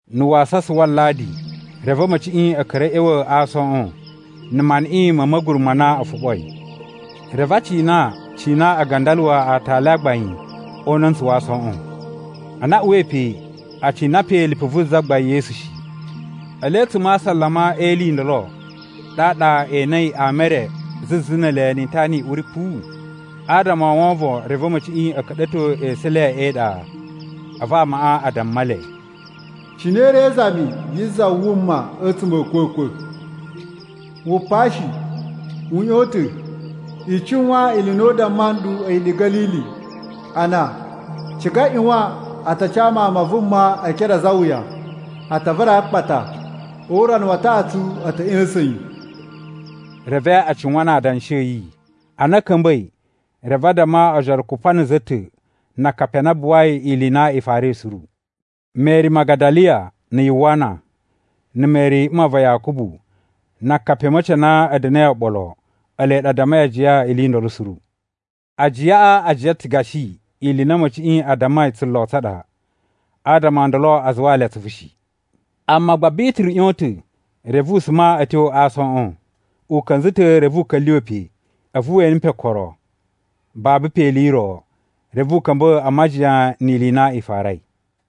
Na̱ wasasa wa Aladi, reve a̱ma̱ciꞌi a̱ ka̱ra̱ a̱ ꞌya̱wa̱ a aasoꞌon, na̱ maniꞌin ma̱ ma̱guru ma na o foɓoi. Reve a cina cina a gandaluwa aatali a gbain o una̱ntsutsu wa aasoꞌon. Ana a uwai pe, a cina pe lipu vu Zagbain Yesu shi. Ele a̱tsuma̱ a asalama e ili i ndolo, ɗaɗa e enei ama e re zuzu ne ele ni itana i uri puwu. Adama o wovon, reve a̱ma̱ciꞌi a̱ ka̱ɗa̱to esu e le e iɗa. A̱vu amaꞌa a damma le, “Cine i ri e izami yi za wuma a̱tsuma̱ a̱ a̱kwa̱kwa̱? Wu pa shi, u ꞌyon ta̱! I cuwan ili i na u damma nɗu a̱yi ɗe Ga̱lili, ana, ‘Ciga ꞌyuwan a ta ca Mawun ma Vuma e ekere a̱ a̱za̱ e iwuya, a ta vara yi a akpata, o urana wa taꞌatsu a̱ ta̱ ꞌya̱sa̱n yi.’” Reve a cuwan na adanshi a̱ yi. Ana a̱ ka̱mba̱i, reve a damma ojoro kupa na̱ za ta̱ na akapi a na a buwai ili i na i farai suru. Meri Magadaliya na̱ Yuwana, na̱ Meri mma va Yakubu, na akapi a̱ma̱ci a na a̱ da̱na̱i oɓolo, ele ɗa a dammai ajiya ili i ndolo suru. Ajiyaꞌa a jiyan ta̱ gashi ili i na a̱ma̱ciꞌi a dammai tsulo tsa ɗa. Adama o ndolo a zuwaa le atsuvu shi. Amma gba Bituru ꞌyon ta̱, reve u suma a̱ tyo a aasoꞌon. U ka̱nza̱ ta̱ reve u ka̱lyuwa̱ pe, a̱vu we ene pe okoro. Babu pe ili i ro. Reve u ka̱mba̱ a majiyan ni ili i na i farai.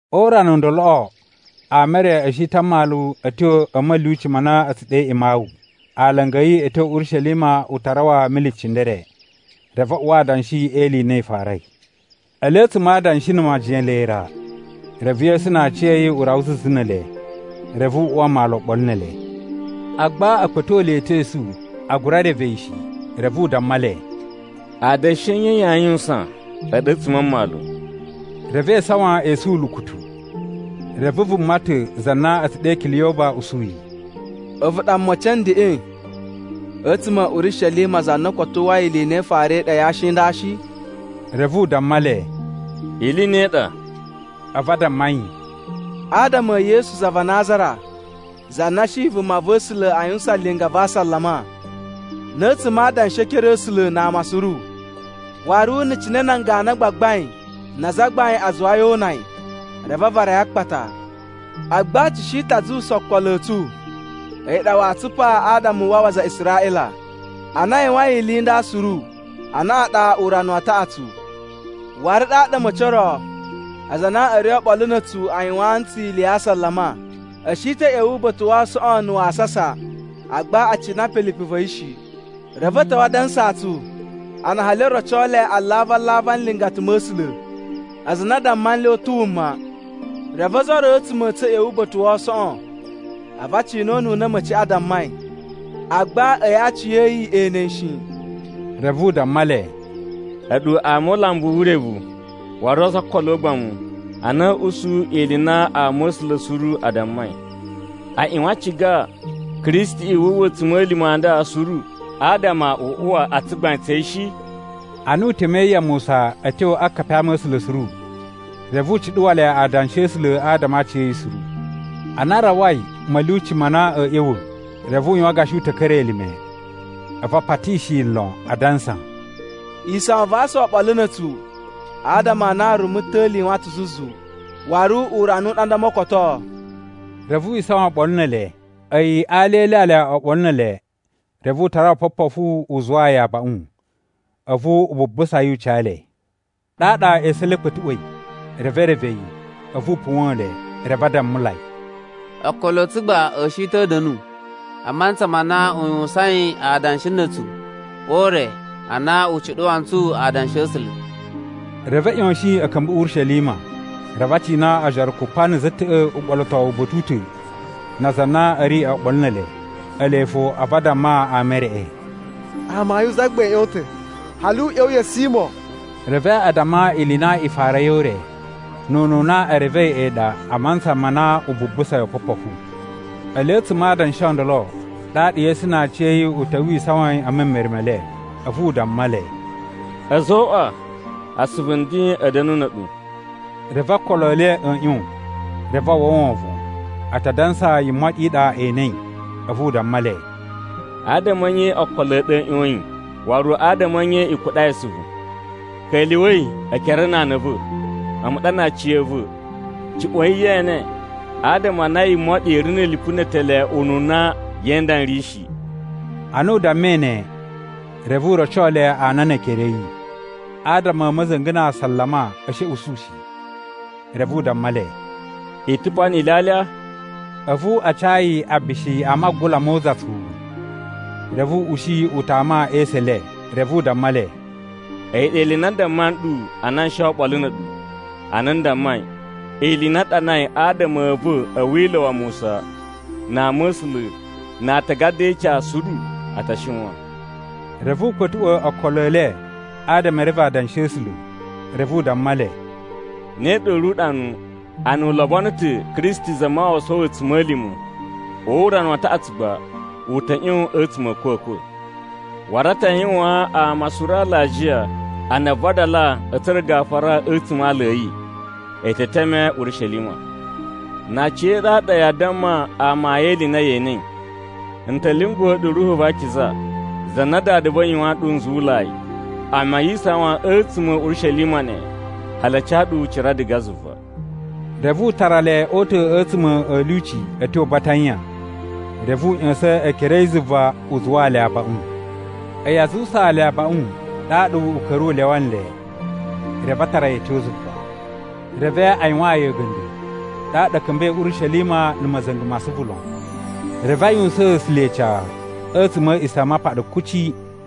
O urana u ndoloꞌo ama e re a̱ shi ta̱ a mmalu a̱ tyo a̱ ma̱lyuci ma na a̱ tsu ɗe Imawu. Alanga a̱ yi a̱ tyo Urishelima u ta rawa mili cindere. Reve a uwa adanshi e ili i na i farai. Ele a̱tsuma̱ a adanshi na̱ majiyan ele ra, reve Yesu na aciya̱yi u rawa zuzu ne ele. Reve u uwa mmalu oɓolo ne ele. Agba a̱ kpa̱to le ta̱ esu a gura reve yi shi. Reve u damma le, “Adanshi a̱ nye yaa yuwusan a̱ɗu a̱tsuma̱ a mmalu?” Reve e isawan esu ulukutu. Reve vuma ta̱ za na a̱ tsu ɗe Kiliyoba usu yi, “A̱vu ɗa mocin a̱ ndeꞌen a̱tsuma̱ a̱ Urishelima za na koto uwwai ili i na i farai ɗe a yashi i nda shi?” Reve u damma le, “Ili i ne i ɗa?” A̱vu a damma yi, “Adama e Yesu za va Nazara, za na shi vumava̱sula̱ a yuwusan linga va asalama na̱ a̱tsuma̱ a adanshi e ekere a̱ A̱sula̱ na ama suru. Waru na̱ cine nan ganu a gbagbain na azagbain a zuwai o una yi, reve a vara yi a akpata. Agba tsu shi ta̱ a zuwusa okolo a̱ tsu a̱yi ɗa waa tsupa adama u wawa aza a Israꞌila. Ana a yuwain ili i nda suru, anaꞌan ɗa urana wa taꞌatsu. “Waru ɗaɗa a̱ma̱ci o ro aza a na a̱ ri oɓolo na̱ a̱tsu a yuwaan ntsu ili ya asalama. A̱ shi ta̱ a̱ ꞌya̱wa̱ uba̱ta̱ wa aasoꞌon na̱ wasasa, agba a cina pe lipu va̱ yi shi. Reve a̱ ta̱wa̱ a dansaa tsu, ana hali o roco le alavu-alavu a nlingata ma̱ A̱sula̱, aza a na a damma nle u ta̱ wuma. Reve ozo o ro a̱tsuma̱ a̱ tsu a̱ ꞌya̱wa̱ uba̱ta̱ wa aasoꞌon. A̱vu a cina ununa a̱ma̱ciꞌi a dammai, agba a̱yi aciya̱yi e ene yi shi.” Reve u damma le, “A̱ɗu ama o ulambu wu urevu, waru ozo o okolo o ugbamu a na a̱a̱ usu ili i na ama̱sula̱ suru a dammai. A ꞌyuwan a ciga Kristiꞌi wu uwwa a̱tsuma̱lima̱ a nda suru adama u uwa o tsugbain tsa̱ yi shi?” Ana u temei ya Musa a̱ tyo akapi a ama̱sula̱ suru, reve u cuɗuwa le Adanshi a̱ A̱sula̱ adama a aciya̱yi suru. Ana a rawai ma̱lyuci ma na a̱a̱ ꞌya̱wa̱, reve u yuwan gashi u ta̱ ka̱ra̱ elime. A̱vu a patishi yi lon, adansa, “Isawan va asa oɓolo na̱ a̱tsu, adama a na rumu ta̱li yuwan ta̱ zuzu. Waru urana u ɗa nda o mokotoo.” Reve wi isawan oɓolo ne ele. A̱yi a alya e ilyalya oɓolo ne ele, reve u tara opopofu u zuwaa yi abaꞌun. A̱vu u bubusa yi u ca le. Ɗaɗa esu e le a̱ kpa̱tuꞌwa̱i, reve e reve yi. A̱vu u puwa̱n le. Reve a dammulai, “Okolo a̱ tsu gba a̱ shi ta̱ a̱ da̱nu a mantsa ma na u yuwusain adanshi na̱ a̱tsu o ure ana u cuɗuwa ntsu Adanshi a̱ A̱sula̱.” Reve a̱ ꞌyoshin a̱ ka̱mba̱ Urishelima. Reve a cina ojoro kupa na̱ za ta̱ꞌa̱ uɓolotowu uba̱ta̱ u ta̱ na aza a na a̱ ri oɓolo ne ele. Ele fo a̱vu a damma ama e reꞌe, “Amayun Zagbain ꞌyon ta̱, hali u ꞌya̱wa̱ ya̱ Simo!” Reve a damma ili i na i farai o ure, nu ununa e revei a̱yi ɗa a mantsa ma na u bubusai opopofu. Ele a̱tsuma̱ a adanshi o ndolo, ɗaɗa Yesu na aciya̱yi u ta̱wa̱ wi isawan e memere me le. A̱vu u damma le, “A̱zoꞌwa! Asuvu nden a̱ da̱nu na̱ a̱ɗu.” Reve okolo e le a̱ ꞌyon, reve a uwwa wovon. A ta dansa yimoɗi i ɗa e enei. A̱vu u damma le, “Adama a̱ nye okolo a̱ ɗu a̱ ꞌyoyin? Waru adama a̱ nye i kuɗai asuvu? Ka̱lyuwa̱i ekere na ana a̱ va̱. A̱mu ɗa na aciya̱va̱. Juꞌwa̱in ye ene, adama a na yimoɗi i ri na̱ lipu ne etele ununa ye e nda n ri shi.” Ana u dammai ne, reve u roco le ana ne ekere a̱ yi. Adama a̱ ma̱za̱nga̱ na asalama a̱ shi a̱ usu shi. Reve u damma le, “I ta̱ pa ni ilyalya?” A̱vu a ca yi abishi a magula mo uzatsuwu. Reve u ushi u tama e esu e le. Reve u damma le, “A̱yi ɗa ili i na n damma nɗu ana n shi oɓolo na̱ a̱ɗu ana n dammai: Ili i na a ɗanai adama a̱ va̱ a̱ Wila̱ wa Musa, na Ama̱sula̱, na Aatagada e Ica suru a ta shiwan.” Reve u kpa̱tuꞌwa̱ okolo e le adama e reve Adanshi a̱ A̱sula̱. Reve u damma le, “Ne ɗa u ri uɗanu: Ana u lobono ta̱ Kristi Zamawawa sowo a̱tsuma̱lima̱, o urana wa taꞌatsu gba u ta̱ ꞌyon a̱tsuma̱ a̱ a̱kwa̱kwa̱. Waru a ta yuwaan ama suru alajiya a na aa vadala a̱ tsura̱ gafura a̱tsuma̱ a aala a̱ yi. E te teme Urishelima. Na aciya̱ɗu a ɗa yaa damma amayun e ili i na ye enei. N ta̱ lyunguwa̱ ɗu Ruhu va Akiza, za na Dada va̱ yuwaan nɗu nzuwulai. Amma yi isawan a̱tsuma̱ a̱ Urishelima neꞌen, hali a ca ɗu ucira diga zuva.” Reve u tara le o uta̱ a̱tsuma̱ a̱ lyuci a̱ tyo Batanya. Reve u ꞌya̱sa̱n ekere a̱ yi zuva u zuwaa le abaꞌun. A̱yi a zuwusaa le abaꞌun, ɗaɗa u ka̱ra̱ u lyawa nle, reve a tara yi a̱ tyo zuva. Reve a yuwaan yi a̱ga̱nda̱, ɗaɗa a̱ ka̱mba̱i Urishelima na̱ ma̱za̱nga̱ ma asuvu lon. Reve a yuwusaan A̱sula̱ ica a̱tsuma̱ a̱ A̱a̱ꞌisamapaɗa kuci.